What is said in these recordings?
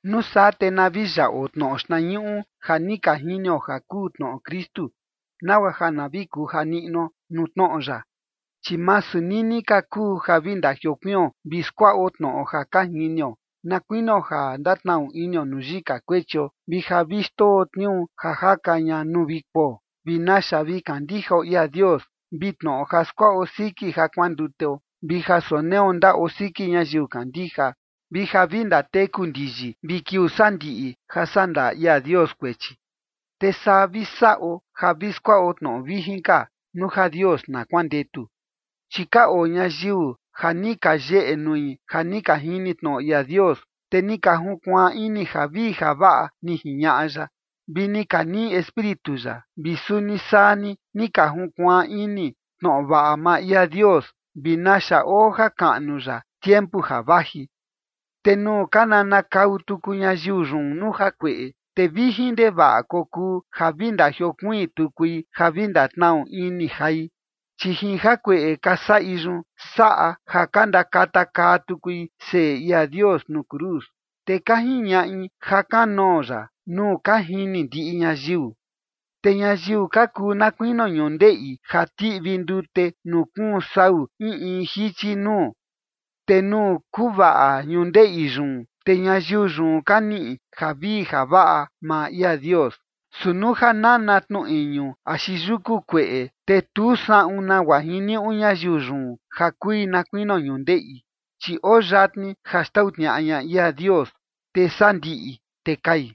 Nuu saa te na vi yaꞌo tnoꞌo xtnañuꞌu ja ni ka jinio ja kuu tnoꞌo Kristu, nagua ja na vi kuja niꞌnuo nuu tnoꞌo ya. Chi masu nini ka kuu ja vi ndajiokuion vi skuaꞌo tnoꞌo ja ka jinio, na kuinio ja ndatnaꞌu inio nuu yika kuechio, vi ja vi xndoo tniuu ja jaka ña nuu vi kuo, vi naxa vi kandijao ia Dios, vi tnoꞌo ja skuaꞌo siki ja kuanduteo, vi ja soneo ndaꞌo siki ñayiu kandija, vi ja vi ndateku ndiyi vi kiuu sandiꞌi ja sandaa ia Dios kuechi. Te saa vi saꞌo ja vi skuaꞌo tnoꞌo vijin ka, nuu ja Dios na kuandetu. Chi ka oo ñayiu ja ni ka yeꞌe nui ja ni ka jini tnoꞌo ia Dios, te ni ka junkuaan ini javii javaꞌa ni jiñaꞌa ya, vi ni ka niꞌi Espíritu ya. Vi suni saa ni, ni ka junkuaan ini tnoꞌo vaꞌa maa ia Dios vi naxa oo jakaꞌnu ya tiempu ja vaji. Te nuu ka nanakau tuku ñayiu yun nuu jakueꞌe, te vijin ndevaꞌa kokuu ja vi ndajiokuiin tukui ja vi ndatnaꞌu ini jai, chi jin jakueꞌe ka saꞌi yun, saꞌa ja ka ndakatakaa tukui Seꞌe ia Dios nuu cruz, te ka jiñaꞌi ja kanoo ya nuu ka jini ndiꞌi ñayiu. Te ñayiu ka kuu na kuinio ñundeꞌi ja tiꞌvi ndute nuu kuun sau in in jichi nuu. Te nuu kuvaꞌa ñundeꞌi yun, te ñayiu yun ka niꞌi javii javaꞌa maa ia Dios. Su nuu ja nana tnu iñu axi yuku kueꞌe, te tu saꞌun nagua jiniuꞌu ñayiu yun ja kui na kuinio ñundeꞌi, chi oo yatni ja xtau tniaꞌa ña ia Dios, te sandiꞌi te kai.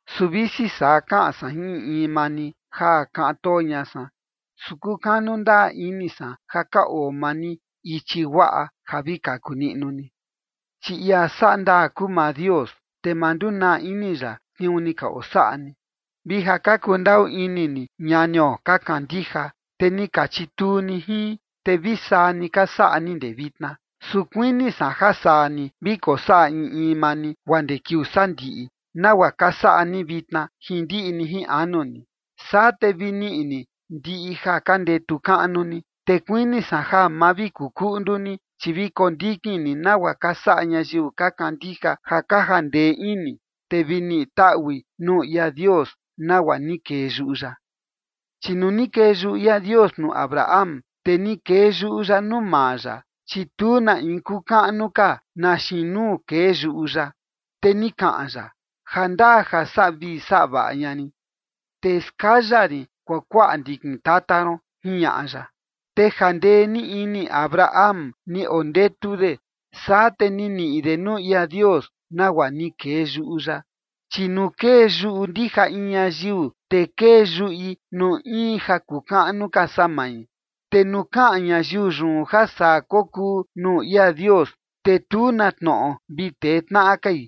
Su visi saa kaꞌan san jin in in maa ni, ja kaꞌan too ña san, su kukanu ndaa ini san ja ka oo maa ni ichi guaꞌa ja vi kaku niꞌnu ni. Chi ia saꞌa ndaa kuu maa Dios, te ma ndunaa ini ya tniuu ni ka osaꞌa ni, vi ja ni ka kundaꞌu ini ni ñanio ka kandija, te ni ka chituu ni jin, te vi saa ni ka saꞌa ni ndee vitna. Su kuini san ja saa ni vi kosaꞌa in in maa ni guaa ndee kiuu sandiꞌi, nagua ka saꞌa ni vitna, jin ndiꞌi ni jin anu ni. Saa te vi niꞌi ni ndiꞌi ja ka ndetu kaꞌnu ni. Te kuini san ja ma vi kuu kuꞌndu ni, chi vi kondikin ni nagua ka saꞌa ñayiu ka kandija ja ka jandee ini, te vi niꞌi taꞌui nuu ia Dios nagua ni kee yuꞌu ya. Chi nuu ni kee yuꞌu ia Dios nuu Abraham, te ni kee yuꞌu ya nuu maa ya, chi tu na in kuu kaꞌnu ka na xiin nuu kee yuꞌu ya. Te ni kaꞌan ya: “Jandaa ja saꞌa vii saꞌa vaꞌa ña rin, te skaya rin kuakuaꞌa ndikin tata ron”, jiñaꞌa ya. Te jandee ni ini Abraham ni ondetu de, saa te ni niꞌi de nuu ia Dios nagua ni kee yuꞌu ya. Chi nuu kee yuꞌu ndija in ñayiu, te kee yuꞌi nuu in ja kuu kaꞌnu ka saa mai. Te nuu kaꞌan ñayiu yun ja saa kokuu nuu ia Dios, te tu na tnoꞌo vi tee tnaꞌa kai.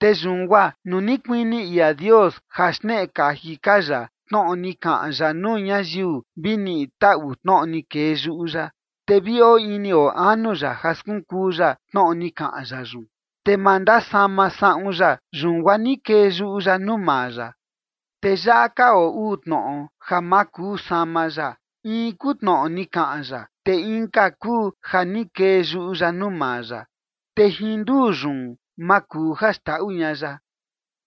Te yun guaa nuu ni kuini ia Dios ja xneꞌe kaji ka ya tnoꞌo ni kaꞌan ya nuu ñayiu vi niꞌi taꞌu tnoꞌo ni kee yuꞌu ya, te vi oo ini oo anu ya ja skunkuu ya tnoꞌo ni kaꞌan ya yun, te ma ndasama saꞌun ya, yun guaa ni kee yuꞌu ya nuu maa ya. Te yaꞌa ka oo uu tnoꞌo ja ma kuu sama ya, in kuu tnoꞌo ni kaꞌan ya, te inka kuu ja ni kee yuꞌu ya nuu maa ya, te jin nduu yun ma kuu ja xndaꞌu ña ya.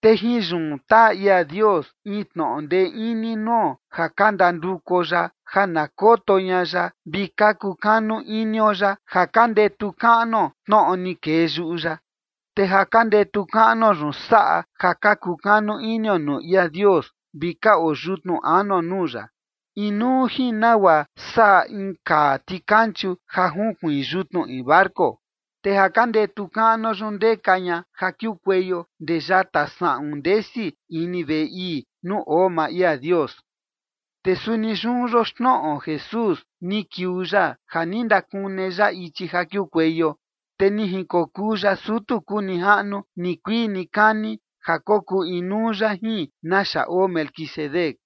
Te jin yun taa ia Dios in tnoꞌo ndee ini nuo ja ka ndandukuo ya ja na koto ña ya vi ka kukanu inio ya ja ka ndetu kaꞌnuo tnoꞌo ni kee yuꞌu ya. Te ja ka ndetu kaꞌnuo yun saꞌa ja ka kukanu inio nuu ia Dios vi ka oo yutnu anuo nuu ya, inuu jin nagua saꞌa in kaa tikanchu ja nukuiin yutnu in barco. Te ja ka ndetu kaꞌnuo yun ndeka ña ja kiukueio ndee yata saꞌun ndesi ini veꞌe ii nuu oo maa ia Dios. Te suni yun yoxnoꞌo Jesús, ni kiuu ya ja ni ndakune ya ichi ja kiukueio, te ni jinkokuu ya sutu kuu nijaꞌnu nikuii nikani ja kokuu inuu ya jin naxa oo Melquisedec.